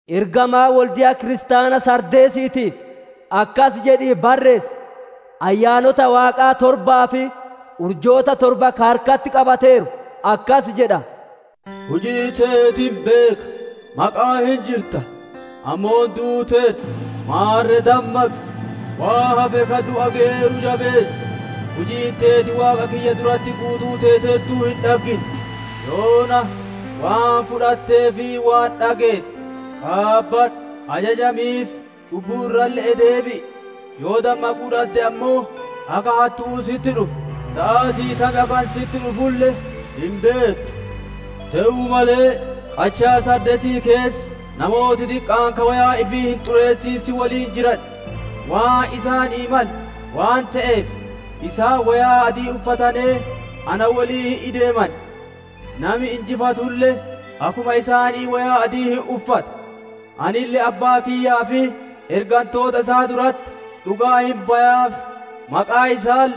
«Ergamaa wolde'a kiristaana Sardeesiitiif akkas jedhii barreessi: «Ayyaanota Waaqaa torbaa fi urjoota torba ka harkatti qabateeru akkas jedha: Hujii teeti hin beeka; maqa'aan hin jirta, ammoo duuteerta. Maarre dammaqi! Waan hafe ka du'a geyeeru jabeessi! Hujiin teeti Waaqa kiyya duratti guutuu teeteertuun hin dhaggine. Yoona, waan fudhattee fi waan dhageette qaabadhu; ajajamiif, cubbuu irralle'ee deebi'i. Yoo dammaquu dhadde ammoo akka hattu'uu sitti dhufa; saatii tam akka ani sitti dhufulle hin beettu. Te'uu malee, qachaa Saardeesii keessa namooti diqqaan ka woyaa ifii hin xureessin si woliin jiran. Waan isaanii male waan te'eef, isaan woyaa adii uffatanee na woliin hin ideeman. Nami injifatulle akkuma isaanii woyaa adii hin uffata; anille Abbaa kiyyaa fi ergantoota isaa duratti dhugaa hin bayaaf; maqaa isaalle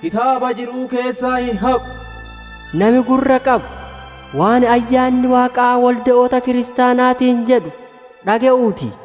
kitaaba jiru'uu keessaa hin haqu. «Nami gurra qabu, waan Ayyaanni Waaqaa wolde'oota kiristaanaatiin jedhu dhage'uu ti.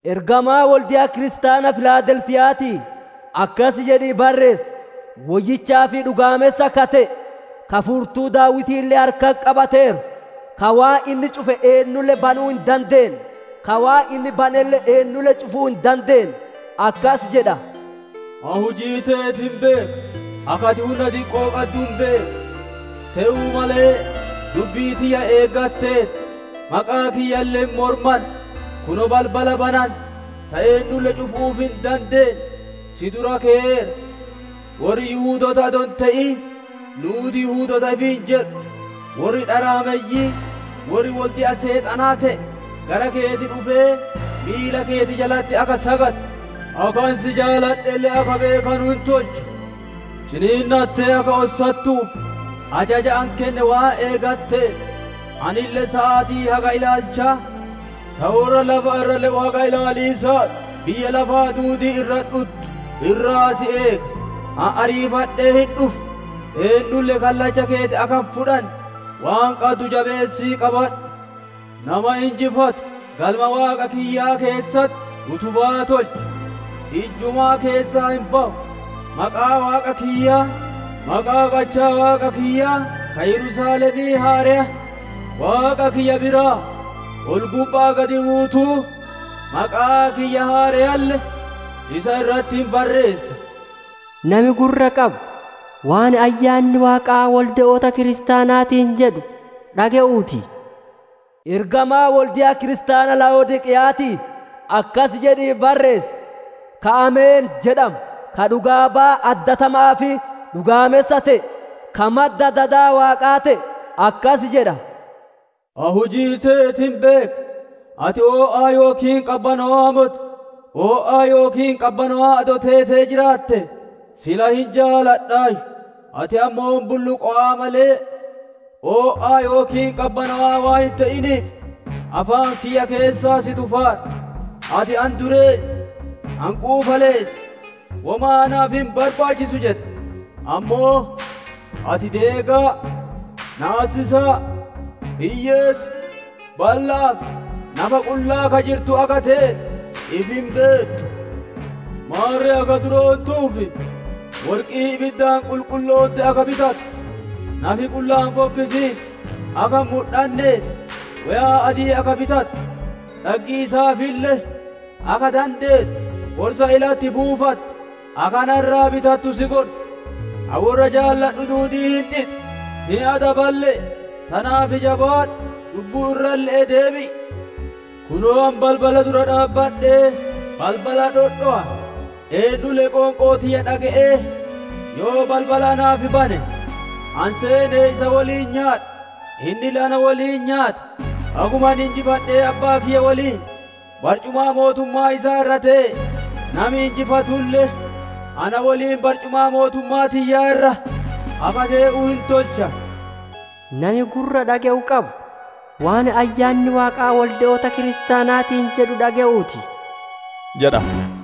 «Ergamaa wolde'a kiristaana Filaadelfiya'aatii akkasi jedhii barreessi: «Woyyichaa fi dhugaamessa ka te'e, ka furtuu Daawitiille harkatti qabateeru, ka waan inni cufe eennulle banuu hin dandeenne, ka waan inni banelle eennulle cufuu hin dandeenne akkasi jedha: Ani hujii teeti hin beeka. Akka ati hunna diqqoo qaddu hin beeka; te'uu malee, dubbii tiyya eeggateerta; maqaa kiyyalle hin mormanne. Kunoo, balbala banante ta eennulle cufiisaaf hin dandeenne si dura keyeera. Worri Yihudoota adoo hin te'in nuuti Yihudoota ifiin jedhu, worri dharaameyyiin, worri wolde'a Seexanaa te'e, gara keeti dhufee miila keeti jalatti akka sagadu, akka ani si jaaladhelle akka beekanu hin tolcha. Ciniinnattee akka ossattuuf ajaja ani kenne waan eeggatteef, anille saatii haga ilaalchaa, ta worra lafa irra le'u haga ilaaliisaaf biyya lafaa duudii irratti dhuttu irraa si eega. «Ani ariifadhee hin dhufa. Eennulle kallacha keeti akka hin fudhanne waan qaddu jabeessii qabadhu. Nama injifatu Galma Waaqa kiyyaa keessatti utubaa tolcha; ijjumaa keessaa hin bawu. Maqaa Waaqa kiyyaa, maqaa qachaa Waaqa kiyyaa ka Yerusaalemii haareya Waaqa kiyya biraa ol-gubba'aa gadi buutuu, maqaa kiyya haareyalle isa irratti hin barreessa. «Nami gurra qabu, waan Ayyaanni Waaqaa wolde'oota kiristaanaatiin jedhu dhage'uu ti. «Ergamaa wolde'a kiristaana Laa'odiiqeya'aatii akkas jedhii barreessi: «Ka ‹Ameen› jedhamu, ka dhugaa-bayaa addatama'aa fi dhugaamessa te'e, ka madda dada Waaqaa te'e akkas jedha: Ani hujii teeti hin beeka; ati o'aa yookiin qabbanowa'aa moti. O'aa yookiin qabbanowaa adoo teetee jiraate sila hin jaaladhaayyu. Ati ammoo bulluqowa'a malee, o'aa yookiin qabbanowaa waan hin te'iniif, afaan kiyya keessaa si tufaara. «Ati, ‹Ani dureessa, ani quufaleessa, womaa naaf hin barbaachisu› jetta; ammoo, ati deegaa, naasisaa, hiyyeessa, balla'aa, fi nafa-qullaa akka ka jirtu akka teete ifi hin beettu. Maarre akka duroontuuf, worqii ibiddaan qulqulloonte akka bitattu, nafi-qullaan fokkisiisu akka hin mudhanneef woyaa adii akka bitattu, dhaggiisaafille akka dandeettu qorsa ilatti buufattu akka na irraa bitattu si gorsa. Ani worra jaaladhu duudii hin xixa, hin adaballe'e. Tanaaf jabaadhu, cubbuu irralle'ee deebi'i. Kunoo, ani balbala dura dhaabbadhee balbala dhodhowa; eennulle qoonqoo tiyya dhage'ee yoo balbala naaf bane, ani seenee isa woliin nyaadha, innille na woliin nyaata. Akkuma ani injifadhee Abbaa kiyya woliin barcumaa mootummaa isaa irra tee'e, nami injifatulle na woliin barcumaa mootummaa tiyyaa irra akka tee'u hin tolcha. «Nami gurra dhage'u qabu, waan Ayyaanni Waaqaa wolde'oota kiristaanaatiin jedhu dhage'uuti!» jedha.